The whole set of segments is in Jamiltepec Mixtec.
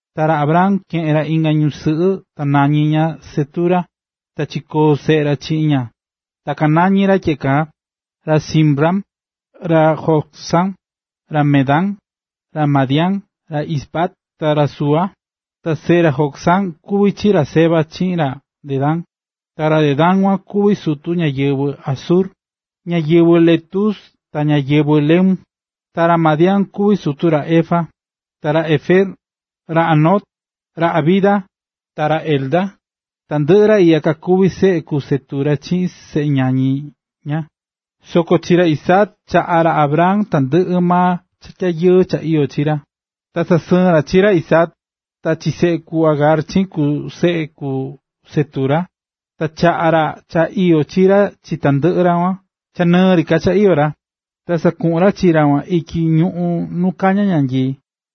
Ta ra Abraham keꞌe̱n ra inga ñusɨꞌɨ ta nañí ña Cetura. Ta chikoo̱ seꞌe ra chiꞌin ña ta kanañí ra tyeꞌe kaa: ra Zimram, ra Jocsán, ra Medán, ra Madián, ra Isbac ta ra Súa. Ta seꞌe ra Jocsán kuví chi ra Seba chiꞌin ra Dedán, ta ra Dedán kuan kuví sutu ñáyɨvɨ Asur, ñáyɨvɨ Letus ta ñáyɨvɨ Leum. Ta ra Madián kuví sutu ra Efa, ra Efer, ra Hanoc, ra Abida, ta ra Elda. Tandɨꞌɨ ra iꞌya kakuví seꞌe ku Cetura chiꞌin seꞌe ñañi ña. Soko chi ra Isaac chaꞌa̱ ra Abraham tandɨꞌɨ maa cha tyayɨɨ cha iyó chi ra. Ta sasɨɨ̱n ra chi ra Isaac, ta chi seꞌe ku Agar chiꞌin seꞌe ku Cetura. Ta chaꞌa̱ ra suꞌva cha iyó chi ra chi tandɨꞌɨ ra kuan cha ñɨɨ ri ka cha iyó ra, ta sakuꞌu̱n ra chi ra kuan ityi ñuꞌún nu kañá ñanyii.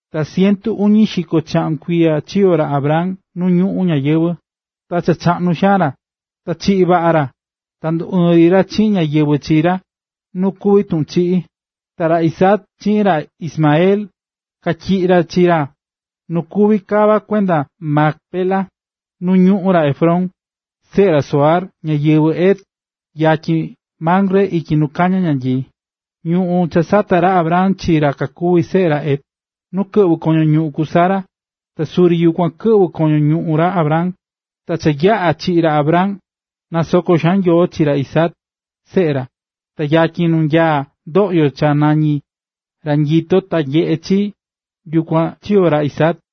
Ta cientu uñi xiko chaꞌun kuiya chiyo̱ ra Abraham nu ñuꞌún ñayɨvɨ̱. Ta cha chaꞌnu xaan ra, ta chiꞌi̱ vaꞌa ra. Ta nduɨɨ̱n ri ra chiꞌin ñáyɨvɨ chi ra, nu kuví tuꞌun chiꞌí. Ta ra Isaac chiꞌin ra Ismael katyiꞌi̱ ra chi ra nu kuví kava kuenda Macpela, nu ñuꞌún ra Efrón, seꞌe ra Zohar, ñáyɨvɨ Het, yatyin Mamre ityi nu kañá ñanyii, ñuꞌún cha sata̱ ra Abraham chi ra kakuví seꞌe ra Het, nu kɨꞌvɨ̱ koño ñuꞌún ku Sara, ta suri yukuan kɨꞌvɨ̱ koño ñuꞌún ra Abraham. Ta cha yaꞌa̱ chiꞌi̱ ra Abraham, nasoko̱ xaan Nyoo chi ra Isaac, seꞌe ra. Ta yatyin nu nyaá ndoꞌyo cha nañí “Ra nyitó ta nyeꞌé ra chii”, yukuan chiyo̱ ra Isaac.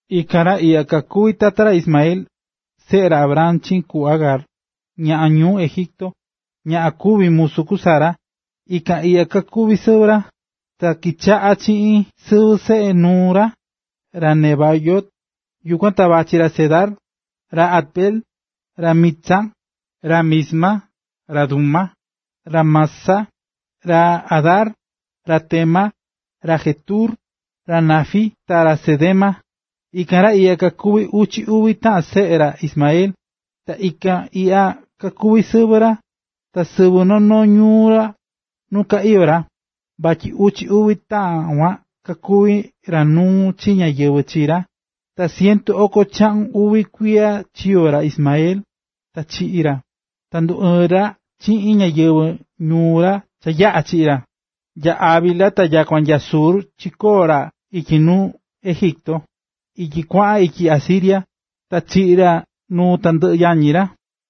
Ikan ra iꞌya kakuví tata ra Ismael, seꞌe ra Abraham chiꞌin ku Agar, ñaꞌan ñuu Egipto, ñaꞌan kuvi̱ musu ku Sara, ikan iꞌya kakuví sɨvɨ ra. Ta kichaꞌa̱ chi chiꞌin sɨvɨ seꞌe nuu ra: ra Nebaiot, yukuan ta vachí ra Cedar, ra Adbeel, ra Mibsan, ra Misma, ra Duma, ra Massa, ra Hadar, ra Tema, ra Jetur, ra Nafis ta ra Cedema. Ikan ra iꞌya kakuví uchi uvi taꞌan seꞌe ra Ismael. Ta ikan iꞌya kakuví sɨvɨ ra, ta sɨvɨ noo noo ñuu ra nu ka iyó ra, vatyi uchi uvi ra kuan kakuví ra nuu chi ñáyɨvɨ chi ra. Ta cientu oko chaꞌun uvi kuiya chiyo̱ ra Ismael, ta chiꞌi̱ ra, ta nduɨɨ̱n ri ra chiꞌin ñáyɨvɨ ñuu ra cha yaꞌa̱ chiꞌi̱ ra. Nya Havila ta nyakua nya Shur chikoo̱ ra ityi nuu Egipto, ityi cha kuaꞌan ityi Asiria. Ta chiꞌi̱ ra nuu tandɨꞌɨ yañi ra.a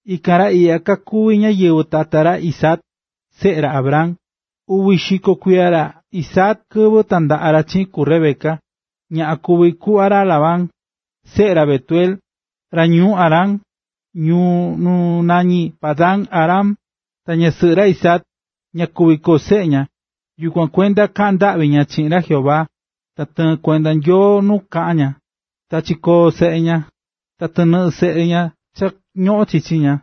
Ikan ra iꞌya kakuví ñáyɨvɨ tata ra Isaac, seꞌe ra Abraham. Uvi xiko kuiya ra Isaac kɨvɨ tandaꞌa̱ ra chiꞌin ku Rebeca, ñaꞌan kuví kuꞌva ra Labán, seꞌe ra Betuel, ra ñuu Aram, ñuu nu nañí Padan-aram. Ta ñasɨꞌɨ ra Isaac, ña kuví koo seꞌe ña, yukuan kuenda kaꞌa̱n ndaꞌvi ra chiꞌin ra Jehová. Ta tɨɨ̱n kuenda Nyoo nu kaꞌa̱n ra, ta chikoꞌo̱n seꞌe ña. Ta tɨnɨꞌɨ seꞌe ña cha ñoꞌón chichi ña,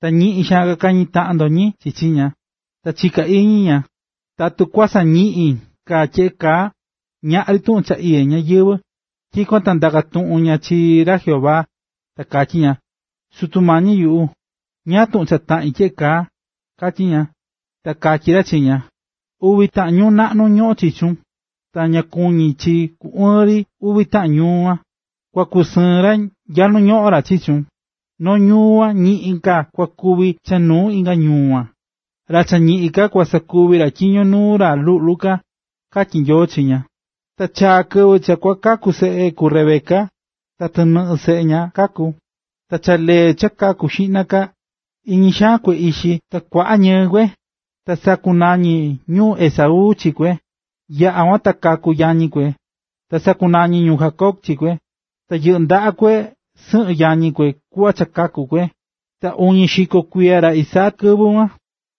ta ñiꞌin xaan kakañí taꞌan ndotyin chichi ña, ta chika̱ iñi ña: “Tatu kua sañiꞌin ka tyeꞌe kaa, ñaꞌri ka tuꞌun cha iyé ñayɨvɨ̱.” Tyikuan ta ndaka̱ tuꞌun ña chi ra Jehová, ta katyí ña: “Sutu mañi yuꞌu, ¿ñáá tuꞌun cha taꞌín tyeꞌe kaa?”, katyí ña. Ta katyí ra chi ña: “Uvi taꞌan ñuu naꞌnu ñoꞌón chichun, ta ña kuví ku ɨɨn ri uvi ñuu kuan, kua kusɨɨn ra nya nu ñoꞌón ra chichun, noo ñuu kuan, ñiꞌin ka kua kuvi cha nuu inga ñuu kuan, ra cha ñiꞌin ka kua sakuvi ra tyiño nuu ra luꞌlu ka”, katyí Nyoo chi ña. Ta chaa̱ kɨvɨ cha kua kaku seꞌe ku Rebeca, ta tɨnɨꞌɨ seꞌe ña kaku̱. Ta cha lee cha kaku̱ xiꞌna ka, iñi xaan kue ixi ta kuaꞌa ñɨɨ kue, ta sakunañi̱ ñu Esaú chi kue. Yaꞌa̱ kuan ta kaku̱ yañi kue, ta sakunañi̱ ñu Jacob chi kue, tyi yɨꞌɨ́ ndaꞌa kue sɨyɨ yañi kue kuꞌva cha kaku̱ kue. Ta uñi xiko kuiya ra Isaac kɨvɨ kuan.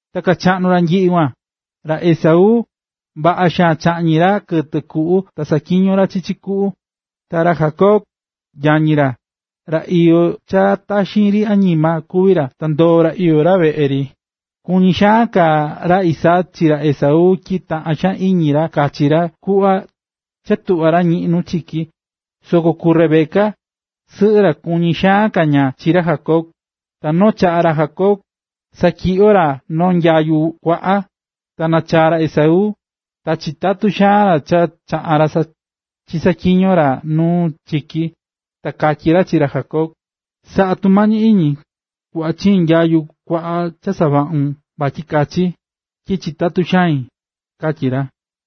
Ta kachaꞌnu̱ ra nyiꞌi kuan, ta ra Esaú, vaꞌa xaan chaꞌñí ra kɨtɨ kuꞌu ta saꞌatyiñó ra chichi kuꞌu. Ta ra Jacob, yañi ra, ra iyó cha taxin ri añima kuví ra, ta ndoó ra iyó ra veꞌe ri. Kuñí xaan ka ra Isaac chi ra Esaú tyi taꞌán xaan iñi ra kachi ra cha tuꞌvá ra ñiꞌín nu chiki. Soko ku Rebeca, sɨꞌɨ ra, kuñí xaan ka ña chi ra Jacob. Ta noo chaꞌa̱, ra Jacob satyiꞌyó ra noo nyayu kuaꞌa, ta nachaa̱ ra Esaú, ta chitatú xaan ra cha chaꞌa̱n ra chisaꞌatyiño̱ ra nu chiki, ta katyí ra chi ra Jacob: ―Sa̱ꞌa tumañi iñi, ku̱ꞌva chiin nyayu kuaꞌa cha savaꞌún vatyi kachi, tyi chitatú xain ―katyí ra.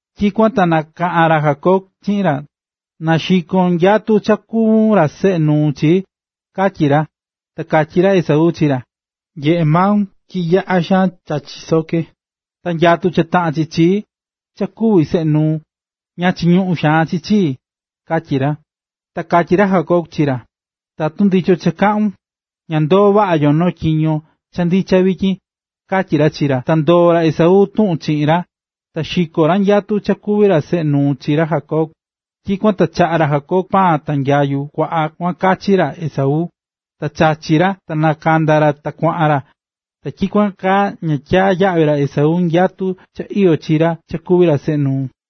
Tyikuan ta nakaꞌa̱n ra Jacob chiꞌin ra: ―Na xikon nyatu cha kuvún ra seꞌe nuu chii ―katyí ra. Ta katyí ra Esaú chi ra: ―Nyeꞌé maun tyi yaꞌá xaan cha chisoké, ta nyatu cha taꞌán chi chii, cha kuví seꞌe nuu, ña chiñuꞌún xaan chi chii ―katyí ra. Ta katyí ra Jacob chi ra: ―Tatu ndichon cha kaꞌún, na ndoo vaꞌa yo noo tyiño cha ndicha vityin ―katyí ra chi ra. Ta ndoo̱ ra Esaú tuꞌun chiꞌin ra, ta xiko̱ ra nyatu cha kuví ra seꞌe nuu chi ra Jacob. Tyikuan ta chaꞌa̱ ra Jacob paan ta nyayu kuaꞌa kuan kachi ra Esaú. Ta chachi̱ ra ta nakanda̱ ra, ta kuaꞌan ra. Ta tyikuan kaa ña tyaa̱ yaꞌvi ra Esaú nyatu cha iyó chi ra cha kuví ra seꞌe nuu.